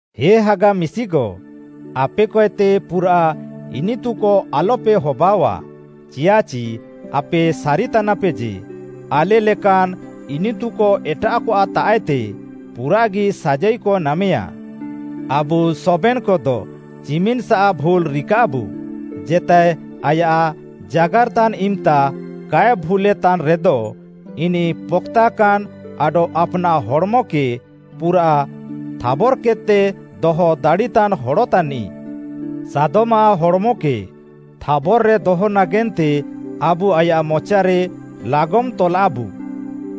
ହେ ହାଗା ମିଶିକ, ଆପେକଏତେ ପୁରାଃ ଇନିତୁକ ଆଲପେ ହବାଅଃଆ। ଚିୟାଃଚି ଆପେ ସାରିତାନାପେ ଯେ, ଆଲେ ଲେକାନ୍‌ ଇନିତୁକ ଏଟାଃକଆଃ ତାଃଏତେ ପୁରାଃଗି ସାଜାଇକ ନାମେୟା। ଆବୁ ସବେନ୍‌କଦ ଚିମିନ୍‌ସା ଭୁଲ୍‌ ରିକାଃବୁ। ଜେତାଏ ଆୟାଃ ଜାଗାର୍‌ତାନ୍ ଇମ୍‌ତା କାଏ ଭୁଲ୍‌ଲେତାନ୍‌ ରେଦ, ଇନିଃ ପକ୍‌ତାକାନ୍‌ ଆଡଃ ଆପ୍‌ନାଃ ହଡ଼୍‌ମକେ ପୁରା ଥାବର୍‌କେଦ୍‌ତେ ଦହ ଦାଡ଼ିତାନ୍‌ ହଡ଼ ତାନିଃ। ସାଦମ୍‌ଆଃ ହଡ଼୍‌ମକେ ଥାବର୍‌ରେ ଦହ ନାଗେନ୍ତେ ଆବୁ ଆୟାଃ ମଚାରେ ଲାଗମ୍‌ ତଲାଃବୁ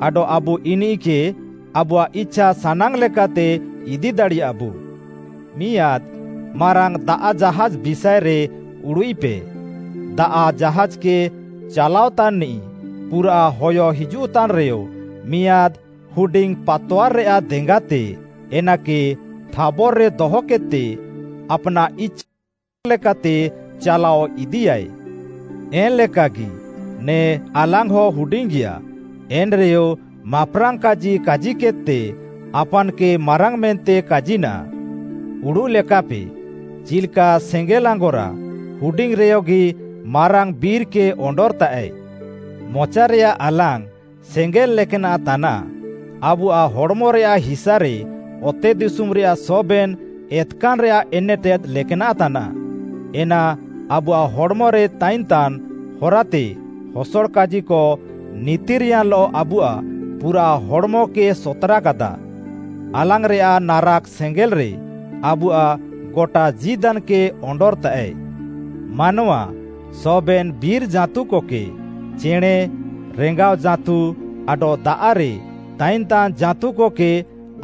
ଆଡଃ ଆବୁ ଇନିଃକେ ଆବୁଆଃ ଇଛାସାନାଙ୍ଗ୍‌ ଲେକାତେ ଇଦି ଦାଡ଼ିୟାଃବୁ। ମିଆଁଦ୍‌ ମାରାଙ୍ଗ୍‌ ଦାଆଃ ଜାହାଜ୍‌ ବିଷାଏରେ ଉଡ଼ୁଃଇପେ, ଦାଆଃ ଜାହାଜ୍‌କେ ଚାଲାଅତାନ୍‌ନିଃ ପୁରାଃ ହୟ ହିଜୁଃତାନ୍‌ରେୟ ମିଆଁଦ୍‌ ହୁଡିଙ୍ଗ୍‌ ପାତୱାର୍‌ରେୟାଃ ଦେଙ୍ଗାତେ ଏନାକେ ଥାବର୍‌ରେ ଦହକେଦ୍‌ତେ ଆପ୍‌ନାଃ ଇଛାସାନାଙ୍ଗ୍‌ ଲେକାତେ ଚାଲାଅ ଇଦିୟାଏ। ଏନ୍‌ଲେକାଗି ନେ ଆଲାଙ୍ଗ୍‌ହ ହୁଡିଙ୍ଗିଆ, ଏନ୍‌ରେୟ ମାପ୍‌ରାଙ୍ଗ୍‌ କାଜି କାଜିକେଦ୍‌ତେ ଆପାନ୍‌କେ ମାରାଙ୍ଗ୍‌ ମେନ୍ତେ କାଜିନାଃ। ଉଡ଼ୁଃ ଲେକାପେ ଚିଲ୍‌କା ସେଙ୍ଗେଲ୍‌ ଆଙ୍ଗରା ହୁଡିଙ୍ଗ୍‌ରେୟଗି ମାରାଙ୍ଗ୍‌ ବିର୍‌କେ ଅଣ୍ଡର୍‌ତାଃଏ। ମଚାରେୟାଃ ଆଲାଙ୍ଗ୍‌ ସେଙ୍ଗେଲ୍‌ ଲେକ୍‌ନାଃ ତାନାଃ, ଆବୁଆଃ ହଡ଼୍‌ମରେୟାଃ ହିସାରେ ଅତେଦିଶୁମ୍‌ରେୟାଃ ସବେନ୍‌ ଏତ୍‌କାନ୍‌ରେୟାଃ ଏନେଟେଦ୍‌ ଲେକ୍‌ନାଃ ତାନାଃ। ଏନା ଆବୁଆଃ ହଡ଼୍‌ମରେ ତାଇନ୍‌ତାନ୍‌ ହରାତେ ହସଡ଼ କାଜିକ ନିତିର୍‌ୟାନ୍‌ଲଃ ଆବୁଆଃ ପୁରା ହଡ଼୍‌ମକେ ସତ୍‌ରାକାଦା। ଆଲାଙ୍ଗ୍‌ରେୟାଃ ନାରାକ୍‌ ସେଙ୍ଗେଲ୍‌ରେ ଆବୁଆଃ ଗଟା ଜୀଦାନ୍‌କେ ଅଣ୍ଡର୍‌ତାଃଏ। ମାନୱା ସବେନ୍‌ ବିର୍‌ ଜାଁତୁକକେ, ଚେଣେଁ, ରେଙ୍ଗାଅଜାଁତୁ ଆଡଃ ଦାଆଃରେ ତାଇନ୍‌ତାନ୍‌ ଜାଁତୁକକେ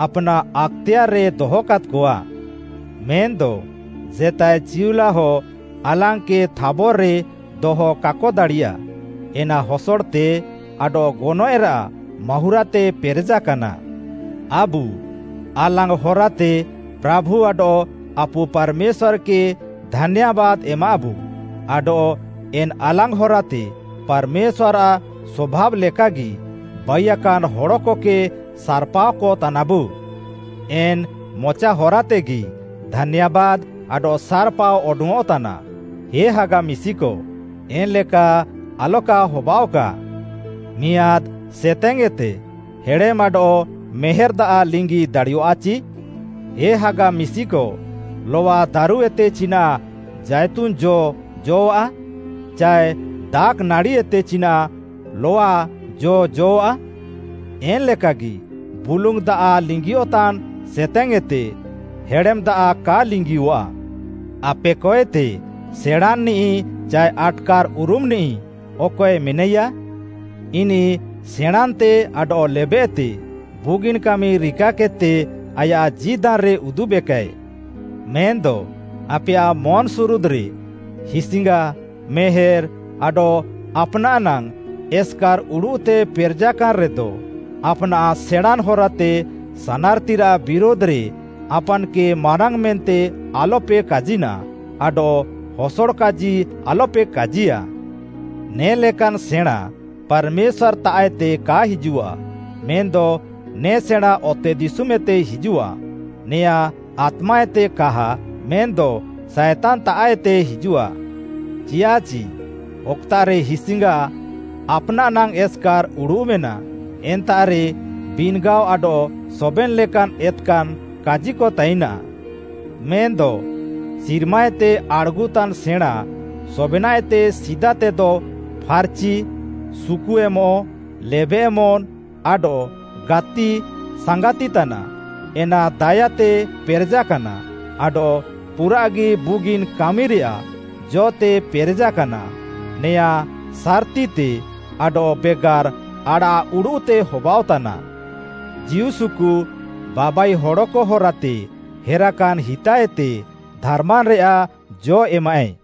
ଆପ୍‌ନାଃ ଆକ୍‌ତେୟାର୍‌ରେ ଦହକାଦ୍‌କଆ। ମେନ୍‌ଦ ଜେତାଏ ଚିଉଲାହ ଆଲାଙ୍ଗ୍‌କେ ଥାବର୍‌ରେ ଦହ କାକ ଦାଡ଼ିୟା। ଏନା ହସଡ଼ତେ ଆଡଃ ଗନଏଃରାଃ ମାହୁଁରାତେ ପେରେଜାକାନା। ଆବୁ ଆଲାଙ୍ଗ୍‌ ହରାତେ ପ୍ରାଭୁ ଆଡଃ ଆପୁ ପାର୍‌ମେଶ୍ୱାର୍‌କେ ଧାନ୍ୟାବାଦ୍‌ ଏମାଃବୁ। ଆଡଃ ଏନ୍‌ ଆଲାଙ୍ଗ୍‌ ହରାତେ ପାର୍‌ମେଶ୍ୱାର୍‌ଆଃ ସଭାବ୍‌ ଲେକାଗି ବାଇୟାକାନ୍‌ ହଡ଼କକେ ସାର୍‌ପାଅକ ତାନାବୁ। ଏନ୍‌ ମଚା ହରାତେଗି ଧାନ୍ୟାବାଦ୍‌ ଆଡଃ ସାର୍‌ପାଅ ଅଡଙ୍ଗ୍‌ଅଃତାନା। ହେ ହାଗା ମିଶିକ, ଏନ୍‌ଲେକା ଆଲକା ହବାଅଃକା। ମିଆଁଦ୍‌ ସେତେଙ୍ଗ୍‌ଏତେ ହେଡ଼େମ୍‌ ଆଡଃ ମେହେର୍‌ ଦାଆଃ ଲିଙ୍ଗି ଦାଡ଼ିୟଃଆଚି? ହାଗା ମିଶିକ, ଲଆଦାରୁଏତେ ଚିନାଃ ଜାଇତୁନ୍‌ ଜ ଜ'ଆ? ଚାଏ ଦାଖ୍‌ନାଡ଼ିଏତେ ଚିନାଃ ଲଆ ଜ ଜ'ଆ? ଏନ୍‌ଲେକାଗି ବୁଲୁଙ୍ଗ୍‌ ଦାଆଃ ଲିଙ୍ଗିୟଃତାନ୍‌ ସେତେଙ୍ଗ୍‌ଏତେ ହେଡ଼େମ୍‌ ଦାଆଃ କା ଲିଙ୍ଗିୟଃଆ। ଆପେକଏତେ ସେଣାଁନ୍‌ନିଃ ଚାଏ ଆଟ୍‌କାର୍‌ଉରୁମ୍‌ନିଃ ଅକଏ ମେନାଇୟା? ଇନିଃ ସେଣାଁନ୍‌ତେ ଆଡଃ ଲେବେଃତେ ବୁଗିନ୍‌ କାମି ରିକାକେଦ୍‌ତେ ଆୟାଃ ଜୀଦାନ୍‌ରେ ଉଦୁବେକାଏ। ମେନ୍‌ଦ ଆପେୟାଃ ମନ୍‌ସୁରୁଦ୍‌ରେ ହିସ୍‌ଙ୍ଗା, ମେହେର୍‌ ଆଡଃ ଆପ୍‌ନାଃ ନାଙ୍ଗ୍‌ ଏସ୍‌କାର୍‌ ଉଡ଼ୁଃତେ ପେରେଜାକାନ୍‌ ରେଦ, ଆପ୍‌ନାଃ ସେଣାଁନ୍‌ ହରାତେ ସାନାର୍‌ତିରାଃ ବିରୁଧ୍‌ରେ ଆପାନ୍‌କେ ମାରାଙ୍ଗ୍‌ ମେନ୍ତେ ଆଲପେ କାଜିନ୍‌ ଆଡଃ ହସଡ଼ କାଜି ଆଲପେ କାଜିୟା। ନେ'ଲେକାନ୍‌ ସେଣାଁ ପାର୍‌ମେଶ୍ୱାର୍‌ତାଃଏତେ କା ହିଜୁଃଆ, ମେନ୍‌ଦ ନେ ସେଣାଁ ଅତେଦିଶୁମ୍‌ଏତେ ହିଜୁଃଆ। ନେଆଁ ଆତ୍ମାଏତେ କାହା ମେନ୍‌ଦ ସାଏତାନ୍‌ତାଃଏତେ ହିଜୁଃଆ। ଚିୟାଃଚି ଅକ୍‌ତାଃରେ ହିସ୍‌ଙ୍ଗା, ଆପ୍‌ନାଃ ନାଙ୍ଗ୍‌ ଏସ୍‌କାର୍‌ ଉଡ଼ୁଃ ମେନାଃ, ଏନ୍ତାଃରେ ବିନ୍‌ଗାଅ, ଆଡଃ ସବେନ୍‌ ଲେକାନ୍‌ ଏତ୍‌କାନ୍‌ କାଜିକ ତାଇନାଃ। ମେନ୍‌ଦ ସିର୍ମାଏତେ ଆଡ଼୍‌ଗୁଃତାନ୍‌ ସେଣାଁ ସବେନାଃଏତେ ସିଦାତେଦ ଫାର୍‌ଚି, ସୁକୁ ଏମଃ, ଲେବେଃମନ୍‌, ଆଡଃ ଗାତିସାଙ୍ଗାତି ତାନାଃ, ଏନା ଦାୟାତେ ପେରେଜାକାନା ଆଡଃ ପୁରାଃଗି ବୁଗିନ୍‌ କାମିରେୟାଃ ଜ'ତେ ପେରେଜାକାନା। ନେଆଁ ସାର୍‌ତିତେ ଆଡଃ ବେଗାର୍‌ ଆଡ଼ାଃଉଡ଼ୁଃତେ ହବାଅଃତାନା। ଜୀଉସୁକୁ ବାବାଇ ହଡ଼କ ହରାତେ ହେରାକାନ୍‌ ହିତାଏତେ ଧାର୍‌ମାନ୍‌ରେୟାଃ ଜ' ଏମାଃଏ।